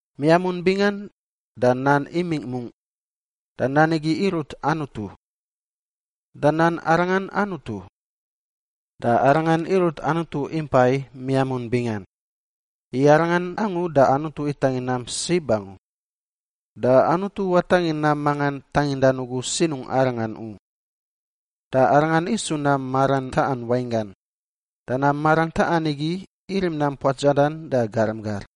Miamun bingan da Nan imingꞌ mungꞌ. Da Nan igi irut Anutu. Da Nan arangan Anutu. Da Arangan irut Anutu impai miamun bingan. I Arangan angu da Anutu itangin nam sib angu, da Anutu watangin nam mangan tangindan ugu sinungꞌ Arangan u. Da Arangan isu nam maran taꞌan wainggan, da nam maran taꞌan igi irim nam puatsadan da garam gar.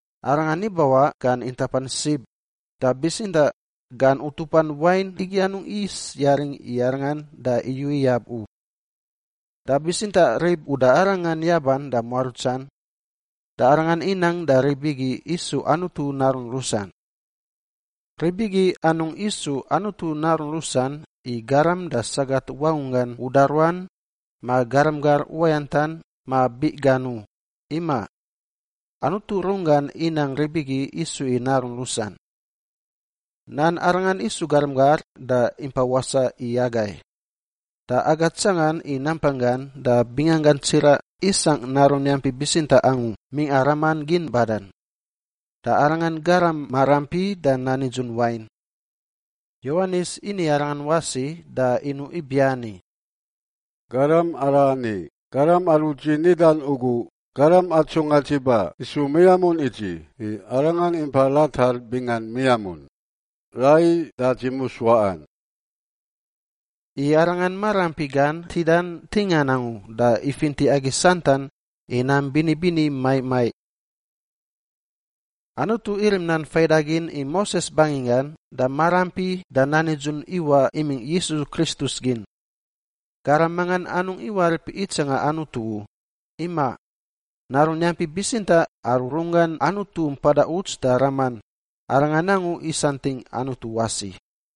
Arangan ibawaꞌ gan intapan sib, da bitsintaꞌ gan utupan wain igi anungꞌ yis yaring i Arangan da iyu iyab u. Da bitsintaꞌ rib uda Arangan yaban da muarutsan, da Arangan inang da rib igi isu Anutu narun rusan. Rib igi anungꞌ isu Anutu narun rusan i garam da sagat wangunggan uda ruan ma garam gar uwayantan ma biꞌ gan u, imaꞌ. Anutu runggan inang rib igi isu i narun rusan. Nan arangan isu garam gar da impa wasaꞌ i agai. Da aga tsangan i nampanggan da binganggan tsiraꞌ isangꞌ Narun yampi bitsintaꞌ angu mingꞌa Raman gin badan. Da Arangan garam maraampi da nan nidzun wain. Yowanis ini Arangan wasi da inuꞌ ibiani, “Garam arani garam aru dzi nidan ugu, ‘Garam atsungꞌa dzi ba isu miamun i dzi, i Arangan impa ratar bingan miamun, raiyi da dzi mus waꞌan.’” I Arangan maraampi gan ntidan ntingan angu da ifinti agi santan i nam bini bini maiꞌ maiꞌ. Anutu irim nan faidagin i Moses banginggan da maraampi da nan nidzun iwaꞌ imingꞌ Yisu Kristus gin. Garam mangan anungꞌ iwarip itsanga Anutu u, imaꞌ. Narun yampi bitsintaꞌ aru runggan Anutu mpada uts da Raman, Arangan angu isantingꞌ Anutu wasi.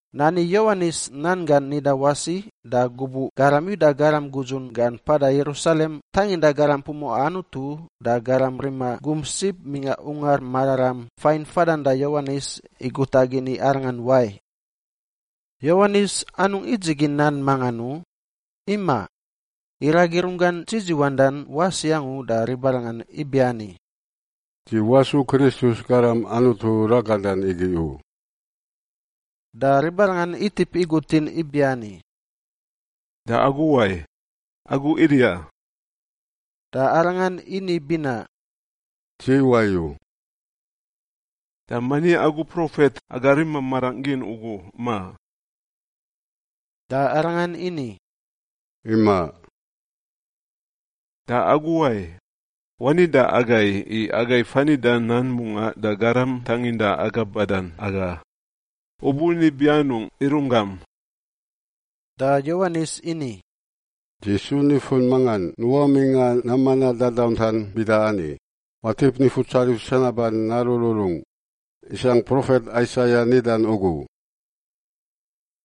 Nani Yowanis nan gan nida wasi da gubuꞌ garam Yuda garam gudzun gan mpada Yerusalem tanginda garam pumuꞌa Anutu da garam rima gum sib mingꞌa Ungar Mararam fain fadan da Yowanis i guta gin i arangan wai. Yowanis anungꞌ idzigin nan mangan u, imaꞌ. Iragi runggan dzidziwandan wasi angu da ribarangan ibiani, “Dzi wasu Kristus, Garam Anutu ragadan igi u.” Da ribarangan itip igutin ibiani, “Da agu wai? Agu Eliya?” Da arangan ini binaꞌ, “Dzi wayu.” “Da mani agu profet aga rima marangꞌ gin ugu, ma?” Da arangan ini, “Imaꞌ.” “Da agu wai? Wani da agai, i aga fanida nan mungaꞌ da garam tanginda aga badan aga. U buni ibi anungꞌ i runggam?” Da Yowanis ini, “Dzi su nifun mangan nuꞌa mingꞌa nam manaꞌ dadauntan bida ani, ‘Watip Nifutsarif sanaban narururungꞌ,’ isangꞌ profet Aisaia nidan ugu.”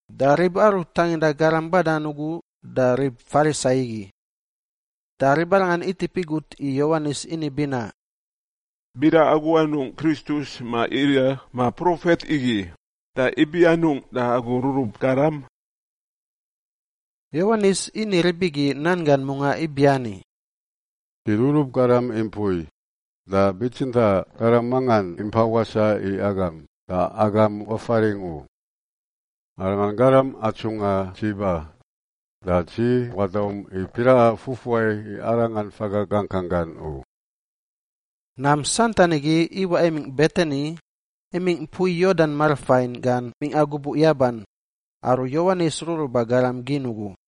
Da rib aru tanginda garam badan ugu da rib Farisai igi. Da ribarangan itip igut i Yowanis ini binaꞌ, “Bida agu anungꞌ Kristus ma Eliya ma profet igi, da ibi anungꞌ da agu rurub garam?” Yowanis ini rib igi nan gan mungaꞌ ibiani, “Dzi rurub garam i mpui, da bitsintaꞌ garam mangan impa wasaꞌ i agam da agam wafaringꞌ u. Arangan garam atsungꞌa dzi ba. Da dzi wadaum i piraꞌa fufuai i Arangan faga gangkang gan u.” Nam santan igi iwaꞌ imingꞌ Betani imingꞌ mpui Yordan marafain gan mingꞌa gubuꞌ yaban, aru Yowanis ruruba garam gin ugu.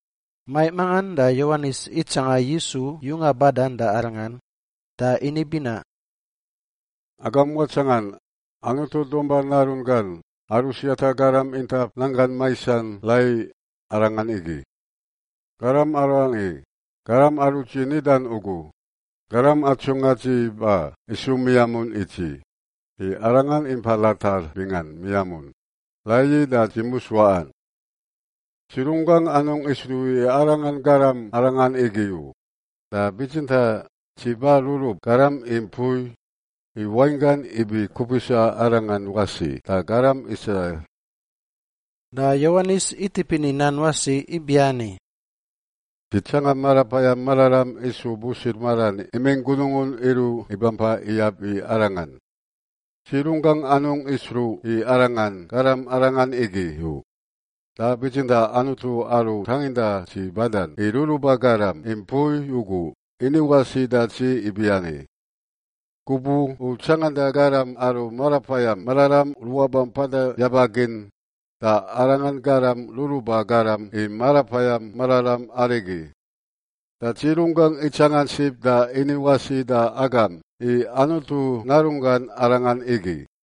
Maiꞌ mangan da Yowanis itsanga Yisu yunga badan da arangan, da ini binaꞌ, “Agam watsangan, Anutu Dumpa Narun gan aru siata garam intap nanggan maisan rai Arangan igi! Garam arani garam aru dzi nidan ugu, ‘Garam atsungꞌa dzi ba isu miamun i dzi, i Arangan impa ratar bingan miamun, raiyi da dzi mus waꞌan.’ Dzi runggangꞌ anungꞌ isruꞌ i Arangan garam arangan igi u, da bitsintaꞌ dzi ba rurub garam i mpui, i wainggan ibi kupisa Arangan wasi da garam Israil.” Da Yowanis itip ini nan wasi ibiani, “Dzi tsanga Marapayam Mararam isu busir maran imingꞌ gunungun iruꞌ ibampa iyab i Arangan. Dzi runggangꞌ anungꞌ isruꞌ i Arangan garam arangan igi u, da bitsintaꞌ Anutu aru tanginda dzi badan i ruruba garam i mpui ugu ini wasi da dzi ibiani, ‘Gubuꞌ u tsanganda garam aru Marapayam Mararam ruꞌa bampada yaba gin, da Arangan garam ruruba garam i Marapayam Mararam arigi.’ Da dzi runggangꞌ itsangan sib da ini wasi da agam i Anutu Narunggan Arangan igi.”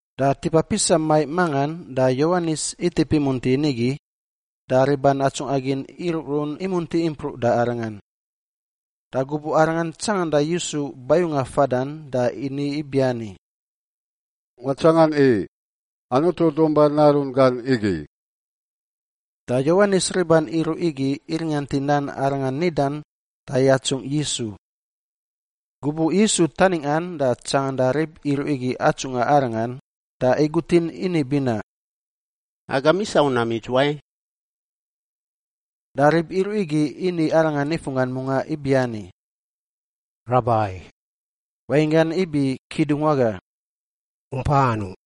Da tipa pisa maiꞌ mangan da Yowanis itip imunti nigi da riban atsungꞌa gin iruꞌrun imunti impruꞌ da arangan. Da gubuꞌ arangan tsanganda Yisu bayunga fadan da ini ibiani, “Watsangan i! Anutu Dumpa Narun gan igi!” Da Yowanis riban iruꞌ igi iringant i nan arangan nidan da yatsungꞌ Yisu. Gubuꞌ Yisu taningꞌan da tsanganda rib iruꞌ igi atsungꞌa Arangan, da igutin ini binaꞌ, “Agam isau nam idzuwai?” Da rib iruꞌ igi ini Arangan nifunggan mungaꞌ ibiani, “Rabai” (wainggan ibi Kidungwaga), “u mpa anungꞌ?”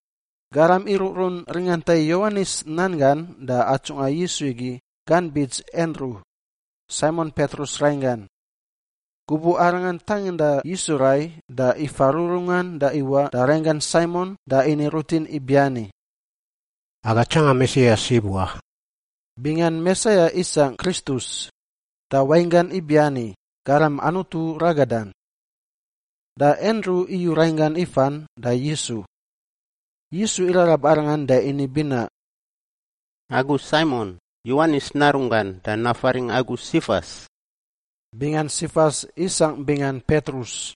Garam iruꞌrun ringanta i Yowanis nan gan da atsungꞌa Yisu igi gan bits Andru, Saimon Petrus rainggan. Gubuꞌ arangan tanginda Yisu rai da ifa rururungan da iwaꞌ da rainggan Saimon da ini rutin ibiani, “Aga tsanga Mesia sib wa.” (Bingan Mesia isangꞌ Kristus, da wainggan ibiani, Garam Anutu ragadan.) Da Andru iyu rainggan ifan da Yisu. Yisu irarab arangan da ini binaꞌ, “Agu Saimon, Yowanis narunggan, da nafaringꞌ agu Sifas.” (Bingan Sifas isangꞌ bingan Petrus,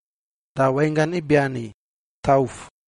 da wainggan ibiani, tauf.)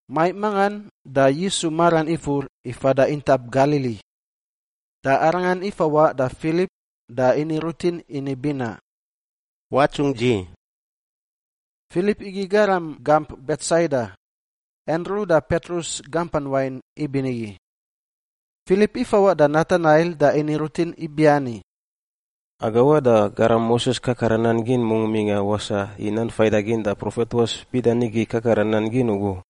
Maiꞌ mangan da Yisu maran ifur i fada intap Galili. Da Arangan ifawaꞌ da Filip da ini rutin ini binaꞌ, “Watsungꞌ dzi.” Filip igi garam gamp Betsaida, Andru da Petrus gampan wain ibinigi. Filip ifawaꞌ da Natanail da ini rutin ibiani, “Aga waꞌ da garam Moses kakara nan gin mungꞌ mingꞌa wasaꞌ i Nan Faidagin da profet ruas bida nigi kakara nan gin ugu.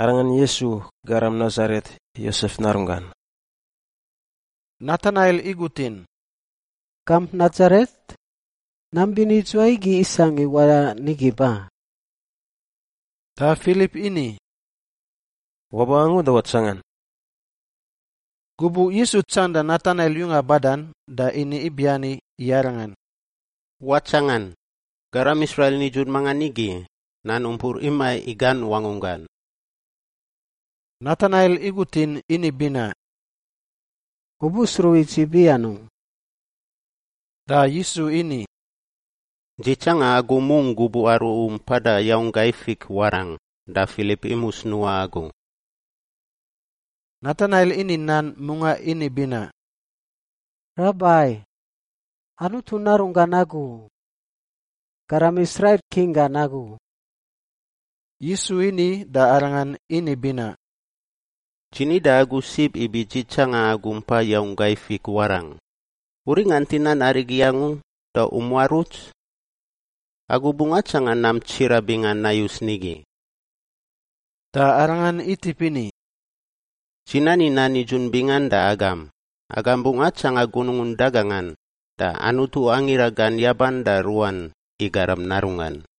Arangan Yisu, garam Nasaret, Yosef narunggan.” Natanail igutin, “Gamp Nasaret? Nam bini idzuwai igi isangꞌ i waꞌa nigi ba?” Da Filip ini, “Waba angu da watsangan.” Gubuꞌ Yisu tsanganda Natanail yunga badan da ini ibiani i arangan, “Watsangan! Garam Israil nidzun mangan igi, nan umpur imaꞌ i gan wangunggan.” Natanail igutin ini binaꞌ, “U busruꞌ i dzi ibi anungꞌ?” Da Yisu ini, “Dzi tsanga agu mungꞌ gubuꞌ aru u mpada yaung gai fik warangꞌ, da Filip imus nuꞌa agu.” Natanail ini nan mungaꞌ ini binaꞌ, “Rabai! Anutu Narunggan agu! Garam Israil King gan agu!” Yisu ini da arangan ini binaꞌ, “Dzi ni da agu sib ibi dzi tsanga agu mpa yaung gai fik warangꞌ; u ringant i nan arigi angu da u muaruts? Agu bungꞌ atsanga nam tsiraꞌ bingan nayus nigi.” Da Arangan itip ini, “Dzi nani nan nidzun bingan da agam, agam bungꞌ atsanga gunungun dagangan da Anutu angira gan yaban da ruꞌan i Garam Narunggan.”